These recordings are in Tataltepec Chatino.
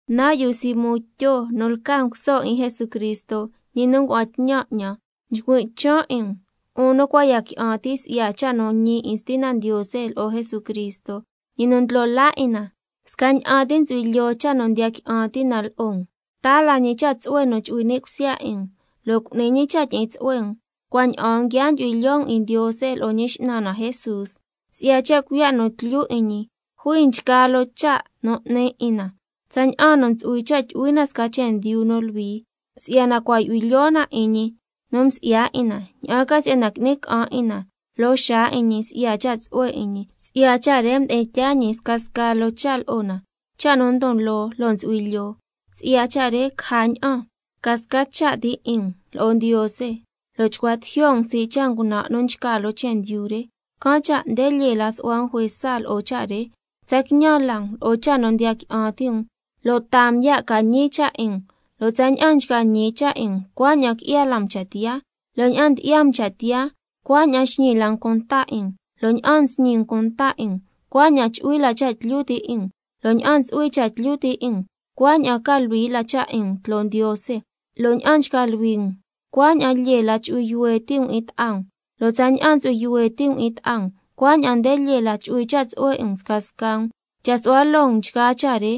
Nan' yu Simón Tyo nu lca nguso 'in Jesucristo, ñi nu ngua'an tñan 'ñan, nchcui' chan' 'in um, 'un nu cua' ya qui'an ti' si'ya cha' nu ñi 'in Stina Ndiose lo'o Jesucristo, ñi nu Ndlo laa 'in na, scaña'an ti ntsu'hui lyoo cha' nu ndiya qui'an ti' na lo'o um. Taa la ñi cha' tsu'hue nu chu'hui ni' cusya 'in um, lo' cu'ni ñi cha' tyi'in tsu'hue um, cua' ña'aan nguia ndyu'hui lyoo um 'in Ndiose lo'o Ñi X'nan na Jesús. Si'ya cha' cuiya' nu tlyu 'in ñi jui nchgaa loo cha' nu 'ni 'in na, tsaña'an nu ntsu'hui cha' tyu'hui na sca chendyu nu luhui, si'yana cua' yu'hui lyoo na 'in ñi nu msi'ya 'in na, ña'an ca si'yana qui'ni ca'an 'in na loo xaa 'in ñi si'ya cha' tsu'hue 'in ñi. Si'ya cha' re mdi'in tyaa ñi scasca loo cha' lo'o na, cha' nu ndon loo lo' ntsu'hui lyoo, si'ya cha' re caja ña'an ca sca cha' ti 'in um lo'o Ndiose, lo' chcua tijyo' um sii' cha' ngunan' nu nchca loo chendyu re. Can' cha' nde lyee la su'hua um juesa lo'o cha' re, tsa quiñan la um lo'o cha' nu ndiya qui'an ti' um lo' taa um ya' ca ñi cha' 'in um, lo' tsaña'an nchca ñi cha' 'in um cuaña'an qui'ya la um cha' tiyaa, lo' ña'an ndyi'ya um cha' tiyaa cuaña'an xñi la um cunta 'in um, lo' ña'an nsñi um cunta 'in um cuaña'an chu'hui la cha' tlyu ti' 'in um, lo' ña'an ntsu'hui cha' tlyu ti' 'in um cuaña'an ca luhui la cha' 'in um tloo Ndiose, lo' ña'an nchca luhui um cuaña'an lyee la chu'hui yuhue ti' um 'in ta'a um, lo' tsaña'an ntsu'hui yuhue ti' um 'in ta'a um cuaña'an nde lyee la chu'hui cha' tsu'hue 'in um scasca um. Cha' su'hua loo um nchgaa cha' re,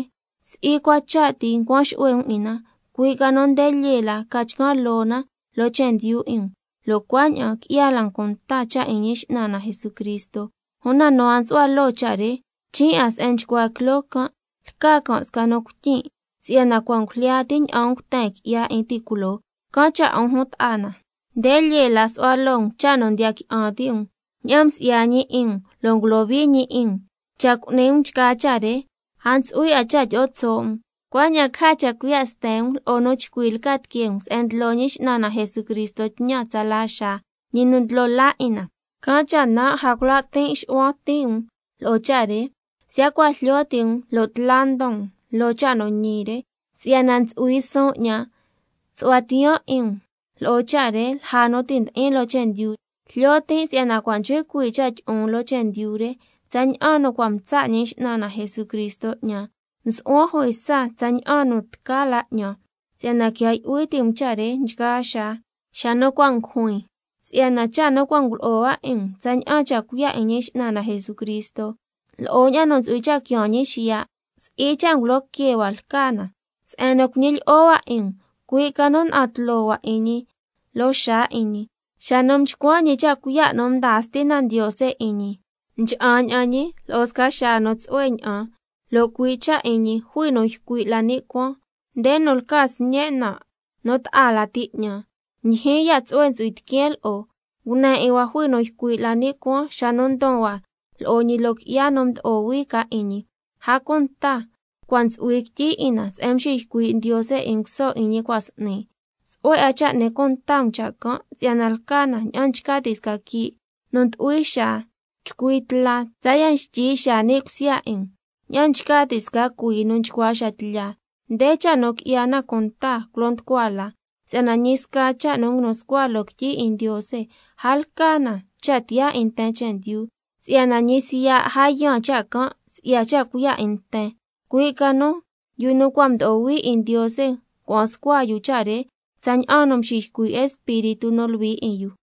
si'i cua cha' ti ncuan xu'hue um 'in na, cui' ca nu nde lyee la ca chcan' loo na loo chendyu 'in um, lo' cuaña'an qui'ya la um cunta cha' 'in Ñi X'nan na Jesucristo. Una nu a nsu'hua loo cha' re, chin' 'a se'en nchcua quiloo can', lca can' sca nu cuityin' si'yana cua' ngujlya ti' ña'an nguten qui'ya 'in ti' culoo. Can' cha' 'un jun ta'a na, nde lyee la su'hua loo um cha' nu ndiya qui'an ti' um ña'an msi'ya ñi 'in um lo' ngulohui ñi 'in um, cha' cu'ni um nchgaa cha' re a ntsu'hui 'a cha' tyi'o tso' um. Cuaña'an caja cha' cuiya' sten um lo'o nu chcui lca tiquee um se'en ndlo Ñi X'nan na Jesucristo tñan tsala xaa, ñi nu Ndlo laa 'in na. Can' cha' nan' a cula' tin' xu'huan ti' um lo'o cha' re, siya' cua' jlyo ti' um lo' tla ndon um lo'o cha' nu ñi re, si'yana ntsu'hui suun 'ñan su'hua tiyaan 'in um lo'o cha' re lja nu ti' ndi'in loo chendyu. Jlyo tin' si'yana cua' nchcui cuii' cha' tyi'on loo chendyu re, tsaña'an nu cua' mtsa' Ñi X'nan na Jesucristo 'ñan. Nsu'huan juesa tsaña'an nu tca la 'ñan, si'yana quia yu'hui ti' um cha' re nchgaa xaa xa nu cua' ngujuin. Si'yana cha' nu cua' ngulo'o hua 'in um tsaña'an cha' cuiya' 'in Ñi X'nan na Jesucristo lo'o ña'an nu ntsu'hui cha' quiaan ñi xiya', si'i cha' ngulo que hua lca na se'en nu cuñilyi'o hua 'in um, cui' ca nu na'an tloo hua 'in ñi loo xaa 'in ñi. Xa nu mchcuan ñi cha' cuiya' nu mdaa Stina Ndiose 'in ñi, mcha'an ña'an ñi lo'o sca xaa nu tsu'hue ña'an, lo' cui' cha' 'in ñi jui nu ycui' la ni' cuaan: Nde nu lca Sñen' nan' nu ta'a lati 'ñan, ndyijyin ya' tsu'hue ntsu'hui tiqueen lo'o. Ngune 'in hua jui nu ycui' la ni' cuaan xa nu ndon hua lo'o ñi loo qui'ya nu mdo'o hui can' 'in ñi. A cunta cua' ntsu'hui quityi 'in na se'en mxiycui' Ndiose nguso 'in ñi cua' s'ni. Tsu'hue 'a cha' n'ni cunta um cha' can', si'yana lca na ña'an nchca ti' sca quii' nu ndyu'hui xaa chcui tla tsaya' xtyi xaa ni' cusya 'in um, ña'an nchca ti' sca cuii nu nchcua xa tlya. Nde cha' nu qui'ya na cunta culo nducua la, si'yana ñi sca cha' nu nguinu scua loo quityi 'in Ndiose, a lca na cha' tiyaa 'in nten chendyu, si'yana ñi siya' a yaan cha' can' si'ya cha' cuiya' 'in nten, cui' ca nu yu nu cua' mdo'o hui 'in Ndiose ngua'an scua yu cha' re tsaña'an nu mxiycui' Espíritu nu Luhui 'in yu.